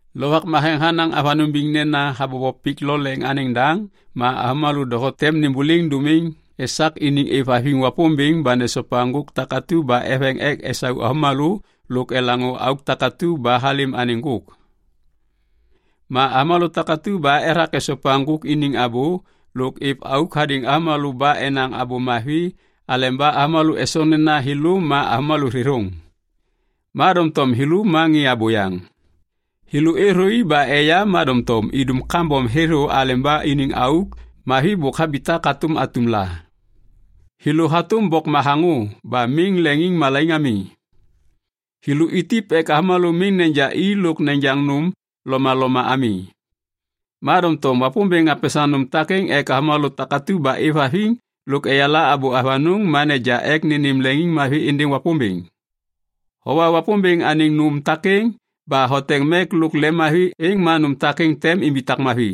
Lovak Matheŋ hanaŋ avanôŋ biŋ nena habobo pik lo leŋ anêŋ daŋ ma avômalô doho tem nêmbôliŋ dômiŋ esak iniŋ êvhaviŋ Wapômbêŋ ba nesopa ŋgôk takatu ba eveŋ ek esau avômalô lôk elaŋô auk takatu ba halêm anêŋ ŋgôk. Ma avômalô takatu ba ethak esopa ŋgôk iniŋ abô lôk êv auk hadêŋ avômalô ba enaŋ abô mavi aleba avômalô esoŋ nena thêlô ma avômalô thêthôŋ. Ma doŋtom thêlô ma ŋê abôyaŋ. Thêlô êthôi ba eya ma doŋtom idum kambom thêthô aleba iniŋ auk mavi bôk habitak hatôm atum la. Thêlô hatôm bok mathaŋô ba miŋ leŋiŋmalaiŋ ami. Thêlô itip ek avômalô miŋ neja i lôk nejaŋ nôm lomaloma ami. Ma doŋtom Wapômbêŋ hapesaŋ nôm takêŋ ek avômalô takatu ba êvhaviŋ lôk eyala abô avanôŋ ma neja ek nênêm leŋiŋmavi êndêŋ Wapômbêŋ. Howa Wapômbêŋ anêŋ nôm takêŋ ba hoteŋ mek lôk lemmavi êŋ ma nôm takêŋ tem imbitak mavi.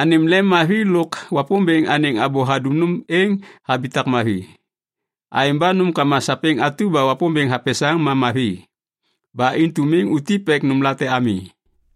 Anêm lemmavi lôk Wapômbêŋ anêŋ abô hadum nôm êŋ habitak mavi. Aêŋ ba nômkama sapêŋ atu ba Wapômbêŋ hapesaŋ ma mavi. Ba intu miŋ utip ek nômlate ami.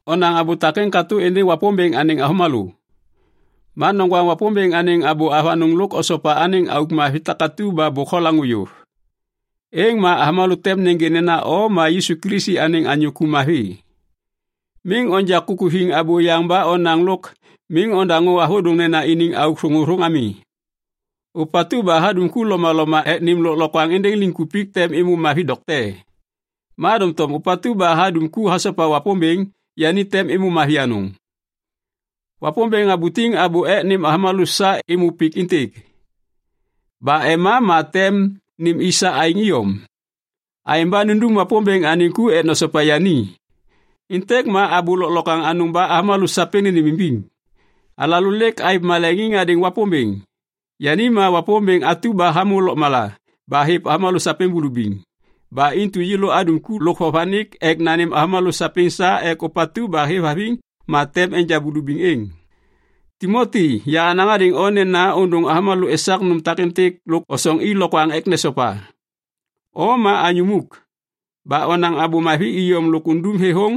Onaŋ abô takêŋ katô êndêŋ Wapômbêŋ anêŋ avômalô. Ma noŋgwaŋ Wapômbêŋ anêŋ abô avanôŋ lôk osopa anêŋ auk mavi takatu ba bôk holaŋô yôv. Êŋ ma avômalô tem nêgê nena o ma Yisu Kilisi anêŋ anyô ku mavi. Miŋ onja kukuthiŋ abôyaŋ ba onaŋ lôk miŋ ondaŋô avôdôŋnena iniŋ auk thôŋôthôŋ ami. Ôpatu ba hadum ku lomaloma ek nêm lôklokwaŋ êndêŋ liŋkupik tem êmô mavi dokte. Ma doŋtom ôpatu ba hadum ku hasopa Wapômbêŋ, yani tem êmô mavi anôŋ. Wapômbêŋ habutiŋ abô ek nêm avômalô sa êmô pik êntêk. Ba ema ma tem nêm i sa aêŋ iyom. Aêŋ ba nundum Wapômbêŋ anêŋ ku ek nosopa yani. Êntêk ma abô lôklokwaŋ anôŋ ba avômalô sapêŋ nênêmimbiŋ. Alalô lêk aêv maleŋiŋ hadêŋ Wapômbêŋ. Yani ma Wapômbêŋ atu ba hamô lôkmala ba hêv avômalô sapêŋ bulubiŋ. Ba intu yêlô adum ku lôk vovanik ek nanêm avômalô sapêŋ sa ek ôpatu ba hêvhaviŋ ma tem enja bulubiŋ êŋ. Timoti yahanaŋ hadêŋ o nena ôndôŋ avômalô esak nôm takêntêk lôk osoŋ i lokwaŋ ek nesopa. O ma anyô muk. Ba onaŋ abô mavi iyom lôk undum thêthôŋ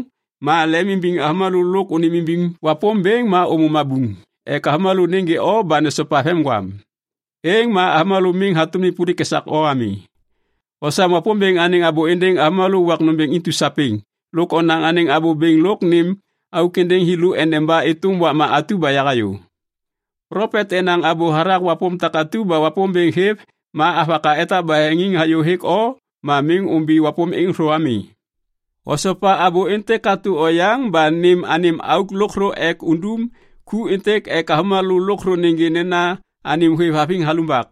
ma lemimbiŋ avômalô lôk ônêmimbiŋ Wapômbêŋ ma ômô mabuŋ ek avômalô nêgê o ba nesopa vemgwam. Êŋ ma avômalô miŋ hatôm nêpôlik esak o ami. Osam Wapômbêŋ anêŋ abô êndêŋ avômalô wak nômbêŋ intu sapêŋ lôk onaŋ anêŋ abô bêŋ lôk nêm auk êndêŋ thêlô endeba êtôm wakma atu ba yahayô. Plopet enaŋ abô hathak wapôm takatu ba Wapômbêŋ hêv ma avaka etak baheŋiŋ hayô hêk o ma miŋ ômbi wapôm êŋ thô ami. Osopa abô êntêk katô oyaŋ ba nêm anêm auk lôkthô ek undum ku êntêk ek avômalô lôkthô nêgê nena anêm hôêvhaviŋ halumbak.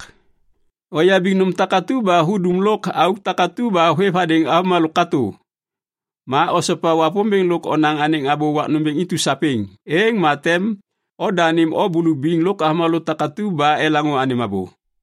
Oyabiŋ nôm takatu ba hudum lôk auk takatu ba hôêv hadêŋ avômalô katô. Ma osopa Wapômbêŋ lôk onaŋ anêŋ abô wak nômbêŋ intu sapêŋ. Êŋ ma tem odanêm o bulubiŋ lôk avômalô takatu ba elaŋô anêm abô.